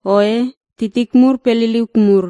Oe titik mur pe liliuk mur,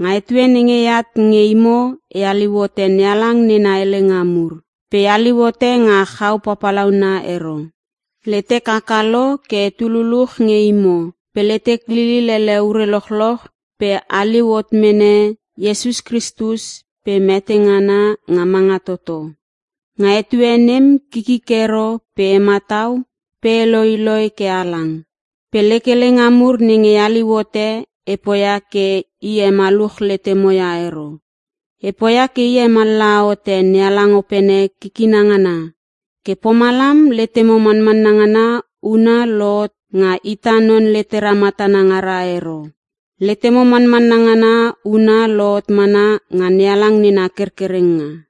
nga etue nenge eat nge imo, e haliu hote NeHalang nena helenga mur. Pe e haliu hote nga chau papalauna ero. Letek haka lo ke etu luluch nge imo pe letek lilil ele ure lochloch pe haliu hot mene Iesus Kristus pe mete ngana nga manga toto. Nga etue nem kikik ero pe e matau pe e loiloi ke halang. Pe lek helenga mur nenge e haliu hote, e poia ke e hemaluch letemo ia ero. E poia ke e hemallaha hote NeHalang Opene kikina ngana. Ke pomalam letemo manmanna ngana huna lohot nga ita non letera matana ngara ero. Letemo manmanna ngana huna lohot mana nga NeHalang nena kerkerenga.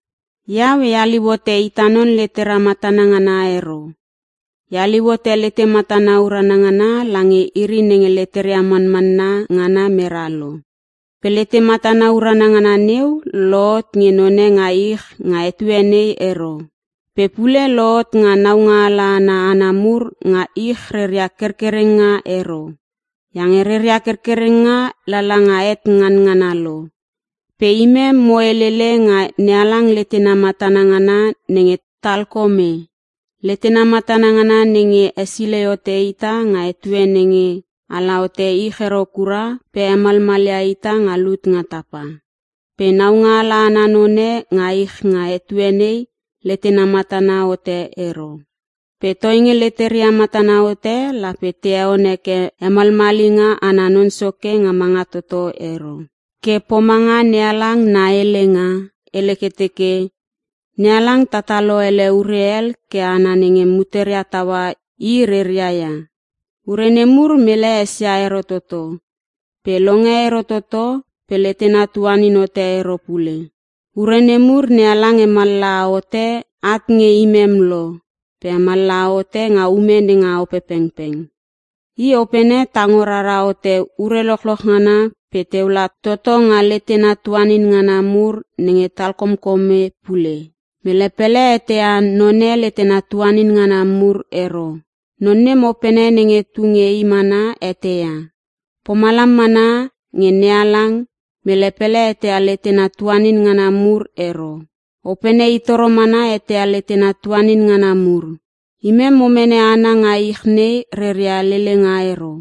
Iau e haliu hote ita non letera matana ngana ero. E haliu hote lete matana urana ngana lange iri nenge leteria manmanna ngana mera lo. Pe lete matana urana ngana neu lohot nge none nga ich nga etue nei ero. Pe pule lohot nga naungaala ana hana mur nga ich reria kerkerenga ero. Iange reria kerkerenga lala nga het nganngana lo. Pe imem, mo helele nga NeHalang letena matana ngana nenge talkome. Letena matana ngana nenge hesilei hote ita nga etue nenge hala hote ich ero kura pe hemalmalia ita nga lut nga tapa. Pe naungaala ana none nga ich nga etue nei letena matana hote ero. Pe toinge leteria matana hote lape te heon heke hamalmalinga ana Non Soke nga manga toto ero. Ke pomanga NeHalang na helenga hele ke teke, “NeHalang tatalo ele ure hel ke hana nenge muteria taua I reria ia. Ure nemur mele esia ero toto pe longe ero toto pe letena tuanin hote ero pule.” Ure nemur NeHalang hemallaha hote at nge imem lo pe hemallaha hote nga ume nenga Opepengpeng. I Opene tango rara hote ure lochloch ngana pe teu la toto nga letena tuanin ngana mur nenge talkomkome pule. Mele pele eteia none letena tuanin ngana mur ero. Non nem opene nenge tu nge i mana eteia. Pomalam mana nge NeHalang, mele pele eteia letena tuanin ngana mur ero. Opene i toro mana eteia letena tuanin ngana mur. Imem mo mene hana nga ich nei reria lelenga ero.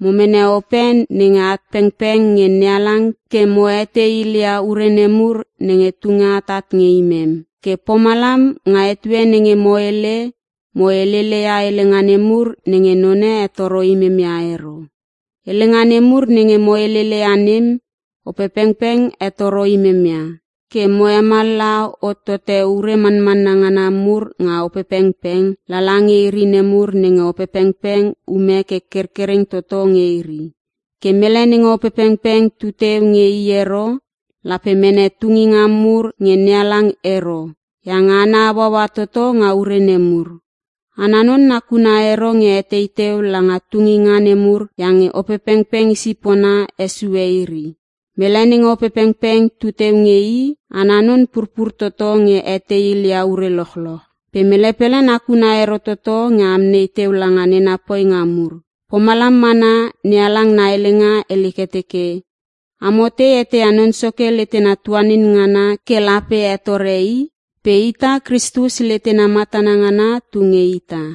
Mo mene Ope nenge at pengpeng nge NeHalang ke mo etei ilia ure nemur nenge tunge atat nge imem. Ke pomalam nga etue nenge mo hele, mo helele ia helenga nemur nenge none hetoro imem ia ero. Helenga nemur nenge mo helele ia nem Opepengpeng hetoro imem ia, ke mo hemallaha hotote ure manmanna ngana mur nga Opepengpeng lala nge iri nemur nenge Opepengpeng ume ke kerkereng toto nge iri. Ke mele nenge Opepengpeng tuteu nge i ero lape mene tunginga mur nge NeHalang ero iange ana hauaua toto nga ure nemur. Ana non nakuna ero nge etei teu la nga tunginga nemur iange Opepengpeng i sipona hesue iri. Mele nenge Opepengpeng tu teu nge i, ana non purpur toto nge etei ilia ure lochloch. Pe mele pele nakuna ero toto nge amnei teu langa nena poinga mur. Pomalam mana NeHalang na helenga hele ke teke, “Amo tei eteia Non Soke letena tuanin ngana ke lape hetore I?” Pe ita, Kristus letena matana ngana tu nge ita.